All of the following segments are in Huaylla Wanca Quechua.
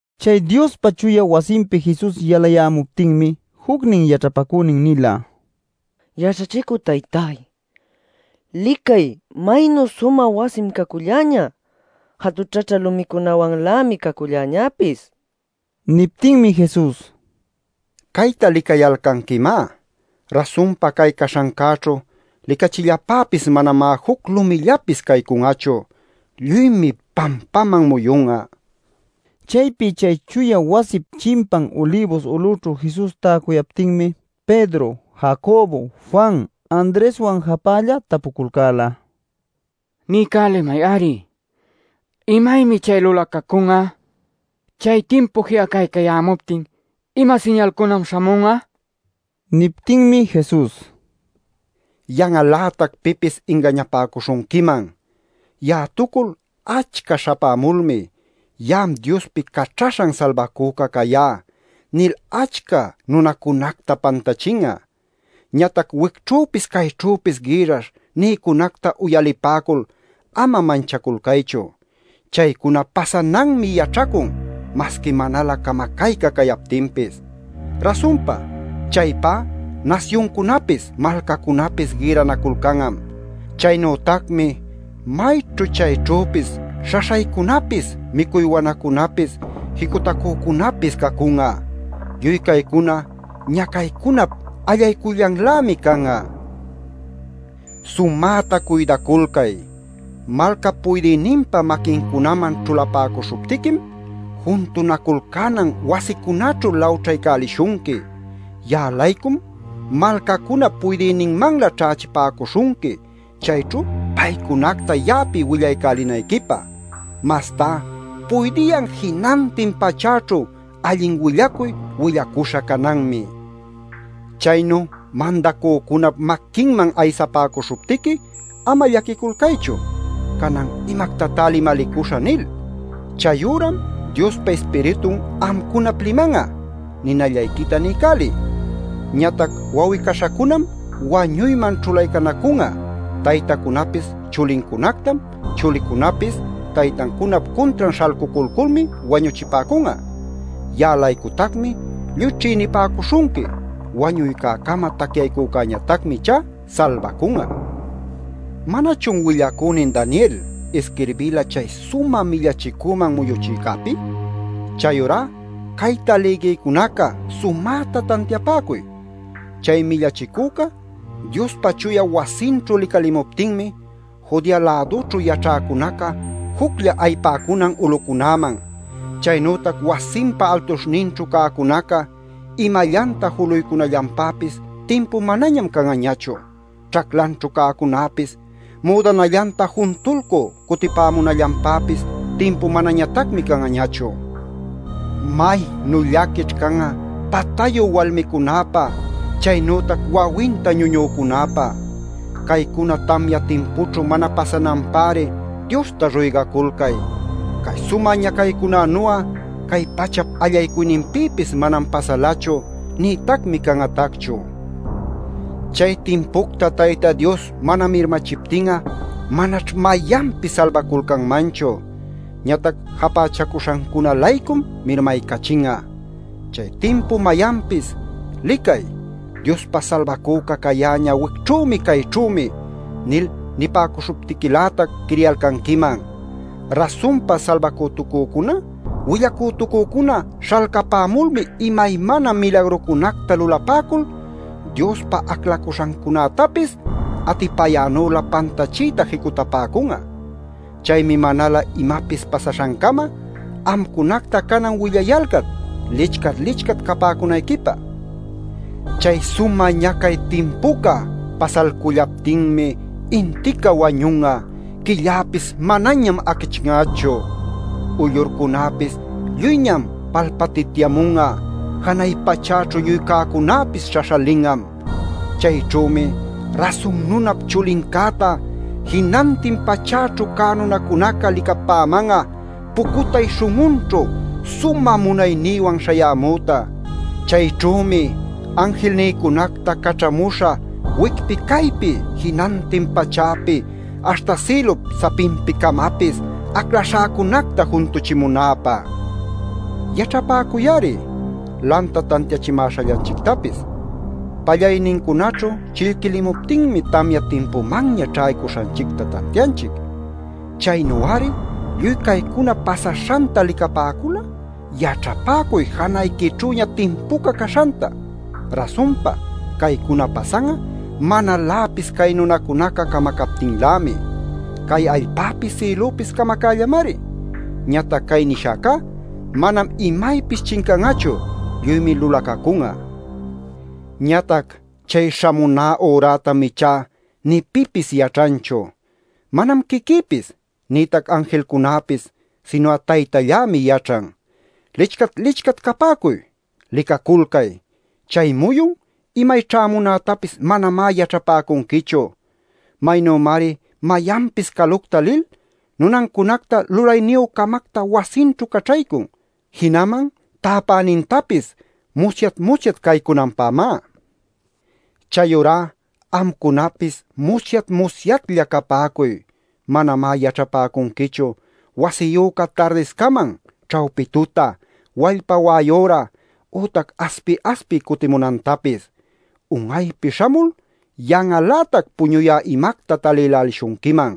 Chay Diospa chuya wasinpi Jesus yalayämuptinmi jucnin yaćhapacünin nila: “Yaćhachicü taytáy, ¡licay, maynu sumä wasim caculläñä; jatućhaćhä lumicunawanlämi cacullañäpis!” nil. Niptinmi Jesus: “Cayta licayalcanquimá. Rasunpa cay caśhancäćhu licachillapäpis manamá juc lumillapis caycun'achu. Lluymi pampaman muyun'a” nin. Chaypi chay chuya wasip chimpan Ulibus ulućhu Jesus täcuyaptinmi Pedro, Jacobo, Juan, Andreswan japälla tapuculcäla: “Niycälimay-ari ¿imaymi chay lulacacun'a? Chay timpu ji'acaycayämuptin ¿ima siñalcunam śhamun'a?” nil. Niptinmi Jesus: “Yan'al-lätac pipis ingañapäcuśhunquiman. Ya'atucul achca śhapämulmi ‘Ya'am Diospi Caćhaśhan Salbacüca cayá’ nil achca nunacunacta pantachin'a. Ñatac wicćhüpis cayćhüpis gïrrash nïcunacta uyalipäcul ama manchaculcaychu. Chaycuna pasananmi yaćhacun masqui manalä camacayca cayaptinpis. Rasunpa chaypá nasyuncunapis malcacunapis gïrranaculcan'am. Chaynütacmi mayćhu chayćhüpis śhaśhaycunapis micuy wanacunapis jicutacücunapis cacun'a. Lluy caycuna ñacaycunap allaycuyllanlämi can'a. “Sumäta cuydaculcay: Malcap puydïninpa maquincunaman ćhulapäcuśhuptiquim juntunaculcänan wasicunäćhu lawćhaycälishunqui. Ya'a-laycum malcacunap puydïninmanlä ćhächipäcuśhunqui, chayćhu paycunacta ya'api willaycälinayquipä. Mastá puydiyan jinantin pachäćhu allin willacuy willacuśha cananmi. Chaynu mandacücunap maquinman aysapäcuśhuptiqui ama llaquiculcaychu ‘Canan ¿imactatá limalicuśhä?’ nil. Chayüram Diospa Ispiritun amcunap liman'a. Ninallayquita niycäliy. “Ñatac wawi-caśhacunam wañuyman ćhulaycanacun'a. Taytacunapis chulincunactam. Chulicunapis taytancunap cuntran śhalcuculculmi wañuchipäcun'a. Ya'a-laycutacmi lluy ćhïnipäcuśhunqui. Wañuycäcama tacyaycücäñatacmi ichá salbacun'a. “¿Manachun willacünin Daniel isquirbila chay Sumä Millachicüman Muyuchïcäpi? Chayurá cayta lïgïcunaca, sumäta tantiapäcuy. Chay Millachicüca Diospa chuya wasinćhu licalimuptinmi, Judea-lädućhu yaćhäcunaca juclla ayipäcunan ulucunäman. Chaynütac wasinpa altuśhninćhu cäcunaca imallanta juluycunallanpäpis timpu manañam can'añachu. Ćhaclanćhu cäcunäpis müdanallanta juntulcü cutipämunallanpäpis timpu manañatacmi can'añachu. ¡Maynu llaquićh can'a patayu walmicunäpä, chaynütac wawinta ñuñücunäpä! Caycuna tamya timpućhu mana pasananpäri Diosta ruygaculcay. Cay sumä ñacaycunanu'a cay pachap allaycuyninpïpis manam pasalachu, nïtacmi can'atacchu. Chay timpucta Tayta Dios mana mirmachiptin'a manaćh mayanpis salbaculcanmanchu; ñatac japächacuśhancuna-laycum mirmaycachin'a. Chay timpu mayanpis ‘¡Licay! ¡Diospa Salbacüca cayäñä wicćhümi, cayćhümi!’ nil nipäcuśhuptiquilätac quiriyalcanquiman. Rasunpa salbacütucücuna willacütucücuna śhalcapämulmi imaymana milagrucunacta lulapäcul Diospa aclacuśhancunätapis atipayänülä pantachiyta jicutapäcun'a. Chaymi manalä imapis pasaśhancama amcunacta canan willayalcac lichcat-lichcat capäcunayquipä. “Chay sumä ñacay timpuca pasalcullaptinmi intica wañun'a; quilläpis manañam acchin'achu; uyllurcunäpis lluyñam palpatityamun'a; janay pachäćhu lluy cäcunäpis śhaśhalin'am. Chayćhümi Rasun Nunap Chulincäta jinantin pachäćhu cä nunacunaca licapäman'a, pucutay śhun'unćhu sumä munaynïwan śhayämüta. Chayćhümi anjilnïcunacta caćhamuśhä wicpi caypi jinantin pachäpi aśhta sïlup sapinpi-camapis aclaśhäcunacta juntuchimunäpä. “Yaćhapäcuy-ari lanta tantiachimäśhallanchictapis. Pallaynincunaćhu chillquilimuptinmi tamya timpumanña ćhaycuśhanchicta tantianchic. Chaynu-ari lluy caycuna pasaśhanta licapäcul'a yaćhapäcuy janayquićhüña timpuca caśhanta. Rasunpa caycuna pasan'a manaläpis cay nunacunaca camacaptinlämi. Cay allpäpis sïlupis camacällamari. Ñatac cay nishäcá manam imaypis chincan'achu; lluymi lulacacun'a. “Ñatac chay śhamuná ürätam ichá nï pipis yaćhanchu. Manam quiquïpis nïtac anjilcunäpis sinu'a Taytallämi yaćhan. ¡Lichcat-lichcat capäcuy! ¡Licaculcay! Chay muyun imay ćhämunätapis manamá yaćhapäcunquichu. Maynümari mayanpis calucta lil nunancunacta lulayniyü-camacta wasinćhu caćhaycun, jinaman täpänintapis musyat-musyat caycunanpämá. “Chayurá amcunapis musyat-musyatlla capäcuy; manamá yaćhapäcunquichu wasiyüca tardiscaman, ćhawpi tuta, wallpa wa'ay üra ütac aspi-aspiy cutimunantapis. Un'aypi śhamul yan'al-lätac puñuyä imacta talïlälishunquiman.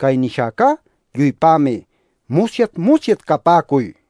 Cay nishäcá lluypämi: ¡Musyat-musyat capäcuy!” nil.